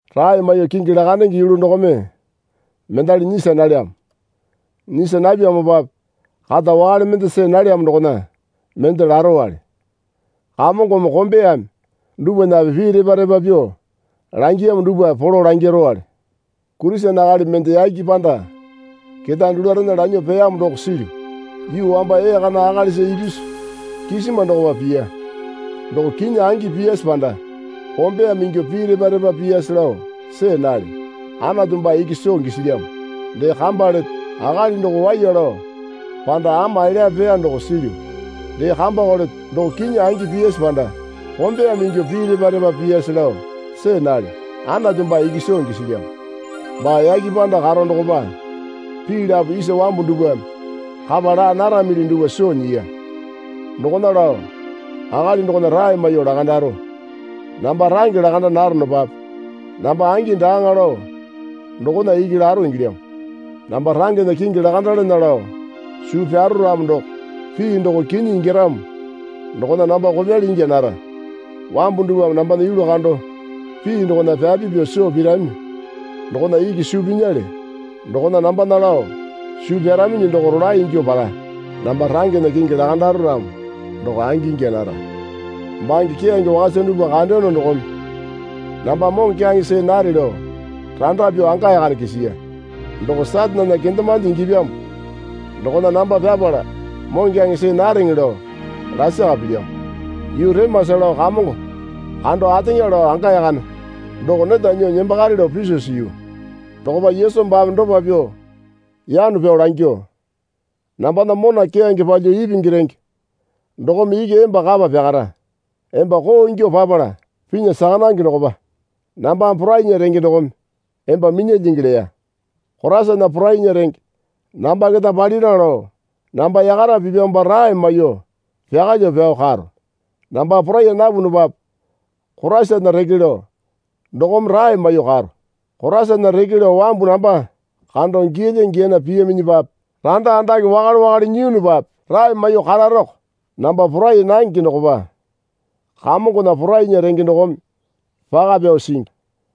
Rae maiyuo kingi lakandenge yulu dokome mendali nyisa nalyamo. Nyisa napyamopape kata wakale mende see nalyamo dokona mende larowale. Kamongome kombeyame dupwanape pii repa repa pyuo langiyamo dupwape polo langirowale. Kurisene akali mende yake panda ketae dulurena lanyuo peyamo doko silyu. Yuu wamba ee kana akalisa ipisu kisima dokopa piya. (Doko kinyi angi piyase panda kombeyame ingyuo pii repa repa piyase lao see nalyo. Anatu baa iki soo gisilyamo.) Dee kamba leto. Akali doko waiya lao panda ama elyape peya doko silyu. (Dee kambako leto. Doko kinyi angi piyase panda kombeyame ingyuo pii repa repa piyase lao see nalyo. Anatu baa iki soo gisilyamo.) Baa yake panda karo dokopa pii lapo isa wambu dupwame kapa laa naramili dupwa soo nyiya. Dokona lao akali dokona rae maiyuo lakandaro. Namba range lakanda naronopape namba angi daaŋa lao dokona iki laro ingilyamo. Namba rangena kingi lakandalana lao suu pyaro ramo doko pii doko kinyi ingyaramo dokona namba kopyali ingya nara. Wambu dupwame nambana yulu kando pii dokona pyapi pyuo soo pirami dokona iki suu pinyale. Dokona nambana lao suu pyaraminyi doko rolae ingyuo para. Namba rangena kingi lakandaro ramo doko angi ingya nara. Bange keyange wakasa dupwa kandeyono dokome namba moŋokyaŋe see nare lao randa pyuo anga yakane kisiya. Doko Satanena kendemande ingyapyamo dokona namba pyapala moŋokyaŋe see nareŋe lao lasaka pilyamo. Yuu remasa lao Kamongo kando ateŋa lao anga yakane doko neta nyuo nembakare lao piso siyu. Dokopa Yesu baame dopa pyuo yano pyao langyuo, Nambana mona keyange palyuo ipingi renge dokome iki emba kapa pyakara. Emba koo ingyuo papala pinya saka nange dokopa nambame porainya renge dokome emba minyalyingi, leya. Koraisana porainya renge namba keta palira lao namba yakara pipyamopa rae maiyuo pyakalyuo pyao karo. Namba porai napunupape Koraisana reke lao dokome rae maiyuo karo. Koraisana reke lao wambu namba kando giyalya giyana piyaminyipape randa andake wakale wakale nyiyunupape rae maiyuo kararoko. Namba poraiya nange dokopa Kamongona porainya renge dokome paka pyao singi.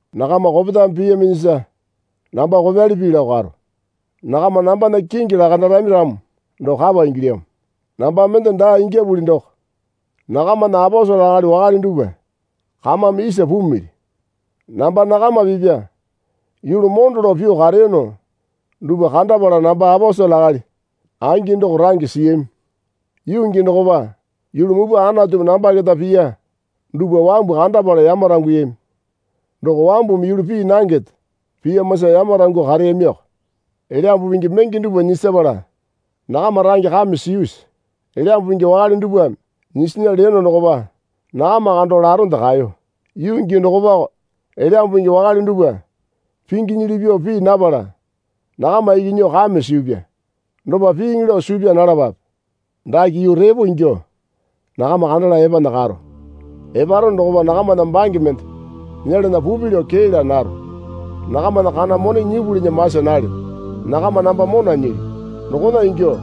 Nakama kopetame piyaminyisa namba kopyali pii lao karo. Nakama nambana kingi lakandarami ramo doko kapa ingilyamo. Namba mende daa ingyapuli doko nakamana aposele akali wakale dupwa kamame isa pumili. Namba nakama pipya yulu mondo lao pyuo kareyono dupwa kandapala namba aposele akali angi doko range siyami. Yuu gii dokopa yulu mupwa Anatumi namba keta piya dupwa wambu kandapala yamaranguyami. Doko wambumi yulu pii nangende piyamosa yamarangyuo kareyamiko. Elyambu Pingi menge dupwa nyisapala nakama range kame siyusi? Elyambu Pingi wakale dupwame nyisinya leyono dokopa nakama kando laronde kaeyo. Yuu gii dokopako Elyambu Pingi wakale dupwa pinginyili pyuo pii napala nakama iki nyuo kame siyupya. Dopa piiŋi lao suu pyaa nalapape. Dake yuu repo ingyuo nakama kandala epana karo. Eparono dokopa nakamana bange mende nyelana pupi lao kee laa naro. Nakamana kana mone nyipulinya masa nalyo. Nakama namba mona nyilyu. Dokona ingyuo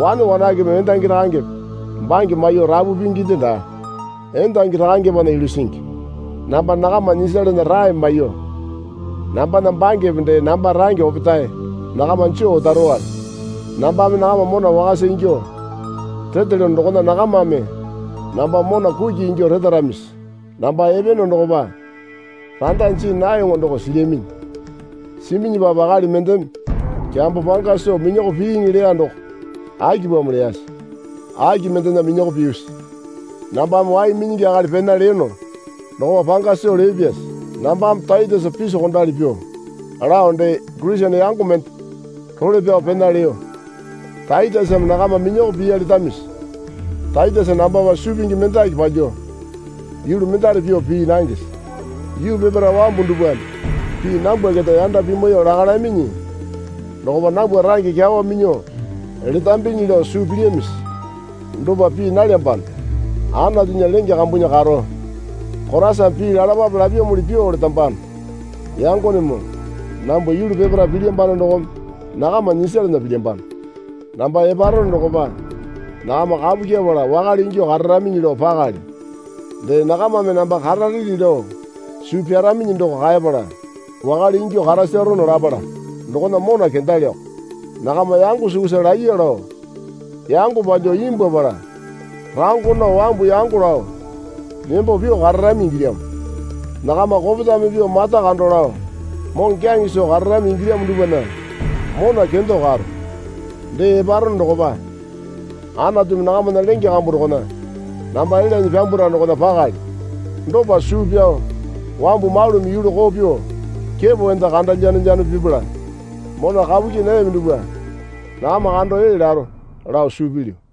wane wanakepeme endangi rakangepe bange maiyuo rapu pinginde daa. Endangi rakangepena yulu singi. Namba nakama nyisalana rae maiyuo nambana bangepe dee namba range opetae nakama joo otarowale. Nambame nakama mona wakasa ingyuo retelyono dokona nakamame namba mona kuki ingyuo retaramisi? Namba epeyono dokopa randa jii nayoŋo doko silyaminyi. Siminyipape akali mendeme kyambo panga soo minyako piiŋi leya doko akipamo leyase? Aki mendena minyako piyusi? Nambame wai minyingi akali pena leyono dokopa panga soo leyopyase? Nambame Taitesa pisokondali pyuo lao dee Kurisene yango mende role pyao pena leyo. Taitesame nakama minyako piya letamisi? Taitesa nambapa suu pingi mendaki palyuo yulu mendare pyuo pii nangese? Yuu peparae wambu dupwame pii nambwa keta yanda pimwaiyuo lakalyaminyi dokopa nambwa range kyawa minyuo letambinyi lao suu pilyamisi? Dopa pii nalyambano. Anatunya lenge kambunya karo Koraisame pii lalapape lapyamuli pyuo letambano. Yangonemoo nambwa yulu peparae pilyambano dokome nakama nyisalana pilyambano. Namba eparono dokopa nakama kapu kyepala wakale ingyuo kararaminyi lao pakalyo. Dee nakamame namba karareli lao suu pyaraminyi doko kaepala wakale ingyuo karasarono lapala dokona mona kendalyoko. Nakama yango sukusa laiya lao yango palyuo imbwuapala rango nao wambu yango lao nembo pyuo kararami ingilyamo. Nakama kopetame pyuo mata kando lao moŋokyaŋe soo kararami ingilyamo dupwana mona kendo karo. Dee eparono dokopa Anatumi nakamana lenge kambu dokona namba elyanyi pyambwara dokona pakalyo. Dopa suu pyao wambu malumi yulu koo pyuo kepo enda kando lyanolyano pipala mona kapu kyii nayami dupwa nakama kando ee laro, lao suu pilyu.